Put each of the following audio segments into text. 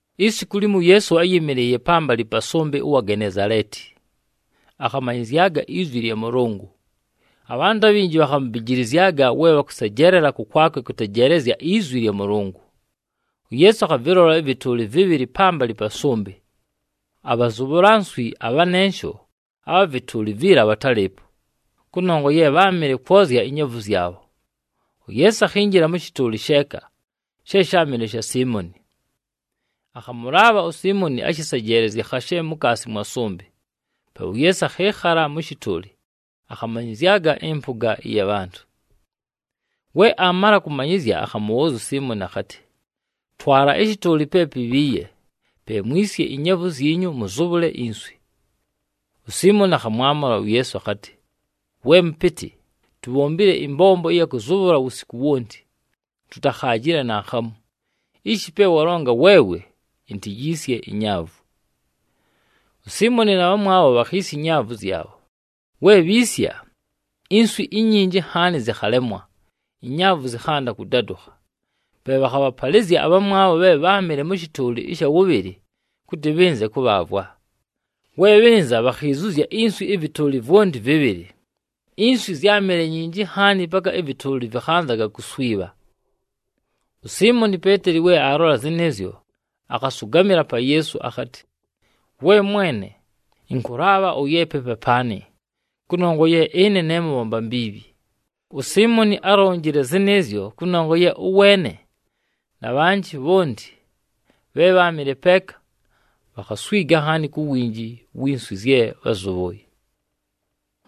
Isiku limo, uYeesu áyɨmɨlɨɨye pambalɨ pa sʉmbɨ ʉwa Genezaleeti, akhamanyɨzyaga izwi lya Mʉlʉngʉ. Abhantʉ abhinji bhakhamubijilizyaga we bhakʉsejeelela kʉkwakwe kʉtejeelezya izwi lya Mʉlʉngʉ. UYeesu akhavɨlola ɨvɨtʉʉlɨ vɨbhɨlɨ pambalɨ pa sʉmbɨ, abhazʉbhʉla nswi abhanensho abha vɨtʉʉlɨ viila bhatálɨɨpo, kʉnongwa ye bháamɨle kwozya inyaavu zyabho. UYeesu akhinjila mʉ shɨtʉʉlɨ sheeka, she sháamɨle sha Siimoni. Akhamʉlaabha uSiimoni ashɨsejeelezye khashe mukaasi mwa sʉmbɨ, pe uYeesu akhɨɨkhala mʉ shɨtʉʉlɨ, akhamanyɨzyaga ɨmpʉga ɨya bhantʉ. We aamala kʉmanyɨzya, akhamʉbhʉʉzya uSiimoni akhatɨ, “Twala ɨshɨtʉʉlɨ pe pibhiiye, pe mwisye inyaavu zyinyu, mʉzʉbhʉle inswi.” USiimoni akhamwamʉla uYeesu akhatɨ, “We Mʉpɨtɨ, tubhombile ɨmbombo ɨya kʉzʉbhʉla wusiku wonti, tutakhaajile naakhamu. Ishi, pe walonga weewe, intiyiisye inyaavu.” USiimoni na bhamwabho bhakhiisya inyaavu zyabho. We bhiisya, inswi inyinji nhaani zɨkhalemwa, inyaavu zɨkhanda kʉdadʉkha. Pe bhakhabhapalɨzya abhamwabho bhe bháamɨle mʉ shɨtʉʉlɨ ɨsha wʉbhɨlɨ, kʉtɨ bhɨnze kʉbhaavwa. We bhɨnza, bhakhiizuzya inswi ɨvɨtʉʉlɨ vwonti vɨbhɨlɨ, inswi zyámɨle nyinji nhaani paka ɨvɨtʉʉlɨ vɨkhanzaga kuswibha. USiimoni Peeteli we aalola zɨnɨɨzyo, akhasʉgamɨla pa Yeesu akhatɨ, “We Mwene, ɨnkʉlaabha ʉyeepe papaanɨ, kʉnongwa ye ɨne ne mʉbhomba mbiibhi.” USiimoni álonjile zɨnɨɨzyo, kʉnongwa ye ʉweene na bhanjɨ bhonti bhe bháamɨle peeka, bhakhaswiga nhaani ku winji wi nswi zye bházʉbhʉʉye.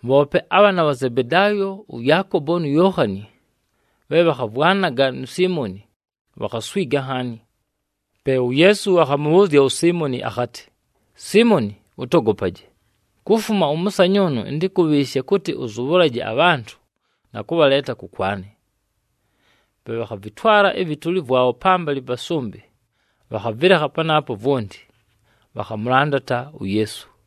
Bhoope abhaana bha Zebedaayo, ʉYaakobo nu Yookhani, bhe bhakhavwanaga nu Siimoni, bhakhaswiga nhaani. Pe uYeesu akhamʉbhʉʉzya uSiimoni akhatɨ, “Siimoni ʉtogopaje, kufuma ʉmʉsanyʉʉnʉ ɨntɨkʉbhɨɨshe kʉtɨ ʉzʉbhʉlaje abhantʉ na kʉbhaleeta kʉkwanɨ.” Pe bhakhavɨtwala ɨvɨtʉʉlɨ vwabho pambalɨ pa sʉmbɨ, bhakhavɨlekha panaapo vwonti, bhakhamʉlandata uYeesu.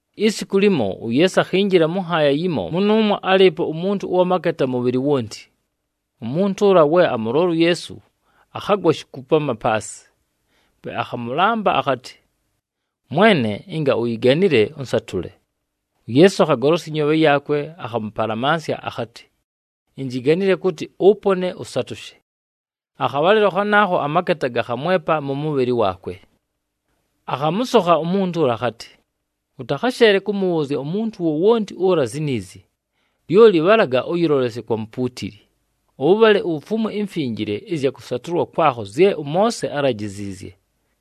Isiku limo, uYeesu akhinjila mʉ nhaaya yimo, mʉnʉʉmwo álɨɨpo umuntu ʉwa maketa mʉbhɨlɨ wonti. Umuntu ʉla we amʉlola uYeesu, akhagwa shikupama paasɨ, pe akhamʉlamba akhatɨ, “Mwene, ɨnga uyiganile, ʉnsatʉle.” UYeesu akhagolosya ɨnyoobhe yaakwe, akhamʉpalamansya akhatɨ, “Injiganile kʉtɨ ʉpone, ʉsatʉshe.” Akhabhalɨlo khanaakho amaketa gakhamwepa mʉ mʉbhɨlɨ waakwe. Akhamʉsokha umuntu ʉla akhatɨ, “Ʉtakhasheele kʉmʉbhʉʉzya umuntu wowonti ʉla ziniizi. Lyoli bhalaga ʉyɨlolesye kwa mupuutili, ʉbhale ufumwe imfinjile ɨzya kʉsatʉlwa kwakho zye ʉMoose álajiziizye,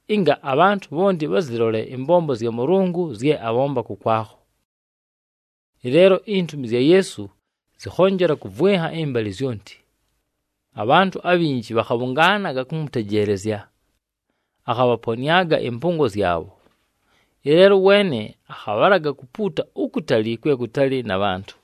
ɨnga abhantʉ bhonti bhazɨlole ɨmbombo zya Mʉlʉngʉ zye abhomba kʉkwakho.” Ɨleelo intumi zya Yeesu zɨkhonjela kʉvwɨnha ɨmbalɨ zyonti. Abhantʉ abhinji bhakhabhʉngaanaga kʉmʉtejeelezya, akhabhaponɨaga ɨmpʉngo zyabho. Ɨleelo ʉweene akhabhalaga kupuuta ukutali kwe kutali na bhantʉ.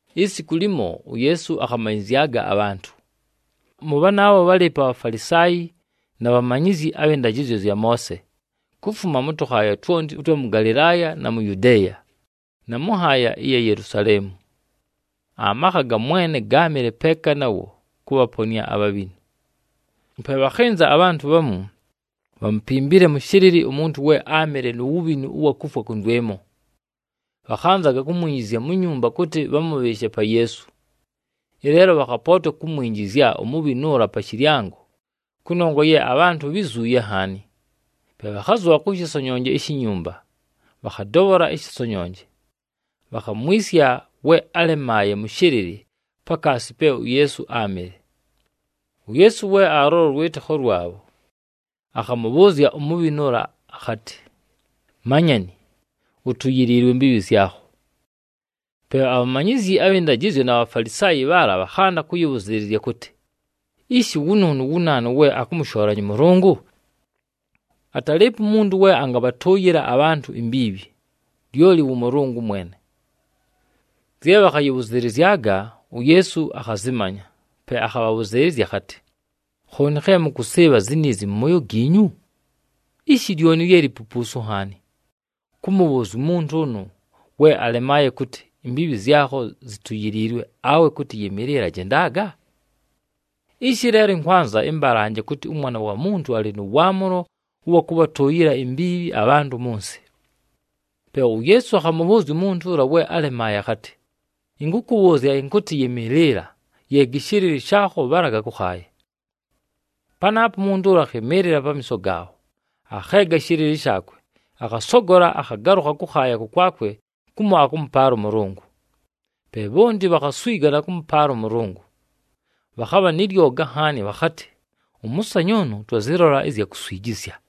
Isiku limo, uYeesu akhamanyɨzyaga abhantʉ. Mʉ bhanaabho bhálɨɨpo aBhafalisaayi na bhamanyizyi abhɨ ndajɨzyo zya Moose, kufuma mʉ tʉkhaaya twonti ʉtwa mʉ Galɨlaaya na mu Yudeeya, na mʉ nhaaya ɨya Yelusaleemu. Amakha ga Mwene gáamɨle peeka nawo kʉbhaponɨa abhabhinu. Pe bhakhɨnza abhantʉ bhamu, bhámupimbile mʉ shɨlɨlɨ umuntu we áamɨle nu wubhinu ʉwa kufwa kʉndwɨmo, bhakhanzaga kumwinjizya mu nyumba kʉtɨ bhamʉbhɨɨshe pa Yeesu. Ɨleelo bhakhapootwa kumwinjizya umubhinu ʉla pa shɨlyango, kʉnongwa ye abhantʉ bhizuuye nhaani. Pe bhakhazʉbha kʉ shɨsonyonje ishi nyumba, bhakhadobhola ɨshɨsonyonje. Bhakhamwisya we álemaaye mʉ shɨlɨlɨ, pakaasi pe uYeesu áamɨle. UYeesu we alʉlola ʉlwɨtɨkho lwabho, akhamʉbhʉʉzya umubhinu ʉla akhatɨ, “Manyani, utuyiliilwe imbiibhi zyakho.” Pe abhamanyizyi abhɨ ndajɨzyo na Bhafalisaayi bhaala bhakhanda kʉyɨbhʉzɨɨlɨzya kʉtɨ, “Ishi wʉnʉʉnʉ wu naanu, we akʉmʉshoolanya ʉMʉlʉngʉ? Atalɨɨpo umuntu we angabhatʉʉyɨla abhantʉ imbiibhi, lyoli wʉ Mʉlʉngʉ mwene.” Zye bhakhayɨbhʉzɨlɨzyaga, uYeesu akhazɨmanya, pe akhabhabhʉzɨɨlɨzya akhatɨ, “Khooni khe mʉkʉsɨɨbha ziniizi mʉ mooyo giinyu? Ishi lyoni lye lipupuusu nhaani: kʉmʉbhʉʉzya umuntu ʉnʉ we alemaaye kʉtɨ, ‘Imbiibhi zyakho zituyiliilwe,’ awe kʉtɨ, ‘Yɨmɨɨlɨla, jendaga’? Ishi leelo ɨnkwanza ɨmbalanje kʉtɨ, ʉMwana wa Muntu alɨ nʉ waamʉlo ʉwa kʉbhatʉʉyɨla imbiibhi abhantʉ mʉ nsɨ.” Pe uYeesu akhamʉbhʉʉzya umuntu ʉla we alemaaye akhatɨ, “Ɨnkʉkʉbhʉʉzya ɨnkʉtɨ yɨmɨɨlɨla, yeega ɨshɨlɨlɨ shaakho, bhalaga kʉkhaaya.” Panaapo umuntu ʉla akhɨmɨɨlɨla pamiiso gaabho, akheega ɨshɨlɨlɨ shaakwe, akhasogola akhagalʉkha kʉkhaaya kʉkwakwe kumo akʉmʉpaala ʉMʉlʉngʉ. Pe bhonti bhakhaswiga na kʉmʉpaala ʉMʉlʉngʉ, bhakhabha nɨ lyoga nhaani, bhakhatɨ, “Ʉmʉsanyʉʉnʉ twazɨlola ɨzya kuswijizya!”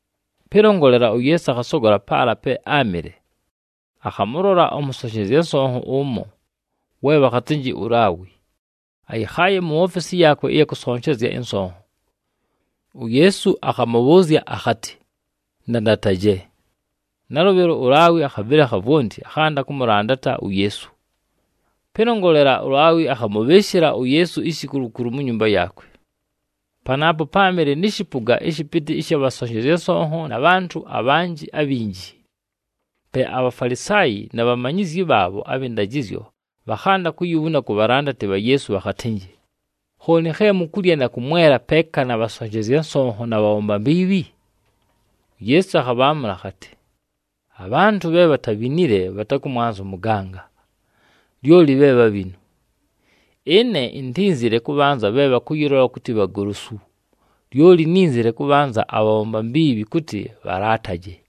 Pɨlongolela, uYeesu akhasogola paala pe áamɨle, akhamʉlola ʉmʉsonshezya nsonho ʉmo, we bhakhatɨnjɨ uLaawi, ayɨkhaaye mu ofesi yaakwe ɨya kʉsonshezya ɨnsonho. UYeesu akhamʉbhʉʉzya akhatɨ, “Ndandataje.” Nalʉbhɨlo, uLaawi akhavɨlekha vwonti, akhanda kʉmʉlandata uYeesu. Pɨlongolela, uLaawi akhamʉbhɨɨshɨla uYeesu ishikulukulu mu nyumba yaakwe. Panaapo páamɨle nɨ shɨpʉga ɨshɨpɨtɨ ɨsha bhasonshezya nsonho na bhantʉ abhanjɨ abhinji. Pe aBhafalisaayi na bhamanyizyi bhaabho abhɨ ndajɨzyo bhakhanda kuyibhuna ku bhalandati bha Yeesu bhakhatɨnjɨ, “Khooni khe mukulya na kʉmwela peeka na bhasonshezya nsonho na bhabhomba mbiibhi?” UYeesu akhabhaamʉla akhatɨ, “Abhantʉ bhe bhatabhinile bhatakʉmwanza ʉmʉganga, lyoli bhe bhabhinu. Ɨne intínzile kʉbhanza bhe bhakʉyɨlola kʉtɨ bhagolosu, lyoli nínzile kʉbhanza abhabhomba mbiibhi, kʉtɨ bhalaataje.”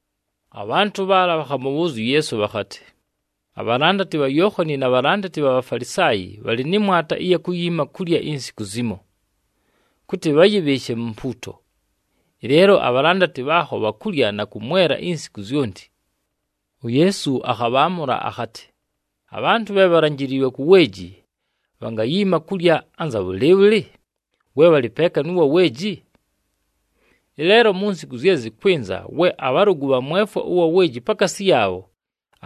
Abhantʉ bhaala bhakhamʉbhʉʉzya uYeesu bhakhatɨ, “Abhalandati bha Yookhani na bhalandati bha Bhafalisaayi bhalɨ nɨ mwata ɨya kuyiima kulya insiku zimo, kʉtɨ bhayɨbhɨɨshe mu mpuuto. Ɨleelo abhalandati bhaakho bhakulya na kʉmwela insiku zyonti!” UYeesu akhabhaamʉla akhatɨ, “Abhantʉ bhe bhalanjiliilwe ku weeji, bhangayiima kulya anza bhʉlɨɨbhʉlɨ, we bhalɨ peeka nʉ wa weeji? Ɨleelo mu nsiku zye zɨkwɨnza, we abhalʉgʉ bhamwefwa ʉwa weeji pakaasi yaabho,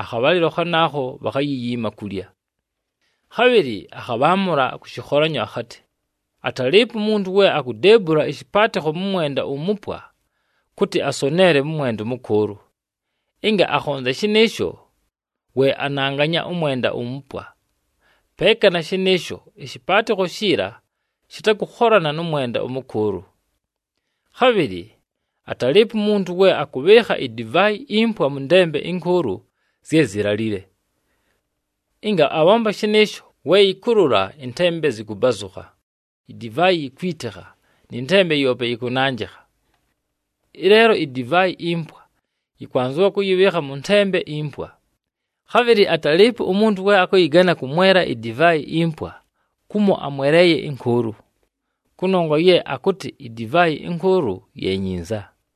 akhabhalɨlo khanaakho bhakhayiyiima kulya.” Khabhɨlɨ akhabhaamʉla kʉ shɨkholanyo akhatɨ, “Atalɨɨpo umuntu we akudeebula ɨshɨpaatɨkho mʉ mwenda umupwa, kʉtɨ asoneele mʉ mwenda ʉmʉkʉʉlʉ. Ɨnga akhonzya shɨnɨɨsho, we ananganya ʉmwenda umupwa. Peeka na shɨnɨɨsho, ɨshɨpaatɨkho shiila shɨtakʉkholana nʉ mwenda ʉmʉkʉʉlʉ. Khabhɨlɨ atalɨɨpo umuntu we akʉbhɨɨkha idivaayi impwa mʉ ntembe ɨnkʉʉlʉ zye zilalile. Ɨnga abhomba shɨnɨɨsho, we yɨkʉlʉla ɨntembe zɨkʉbazʉkha, idivaayi yikwitikha nɨ ntembe yoope yɨkʉnanjɨkha. Ɨleelo, idivaayi impwa yɨkwanzɨwa kʉyɨbhɨɨkha mʉ ntembe impwa. Khabhɨlɨ atalɨɨpo umuntu we akʉyɨgana kʉmwela idivaayi impwa, kumo amweleeye ɨnkʉʉlʉ, kʉnongwa ye akʉtɨ idivaayi ɨnkʉʉlʉ ye nyinza.”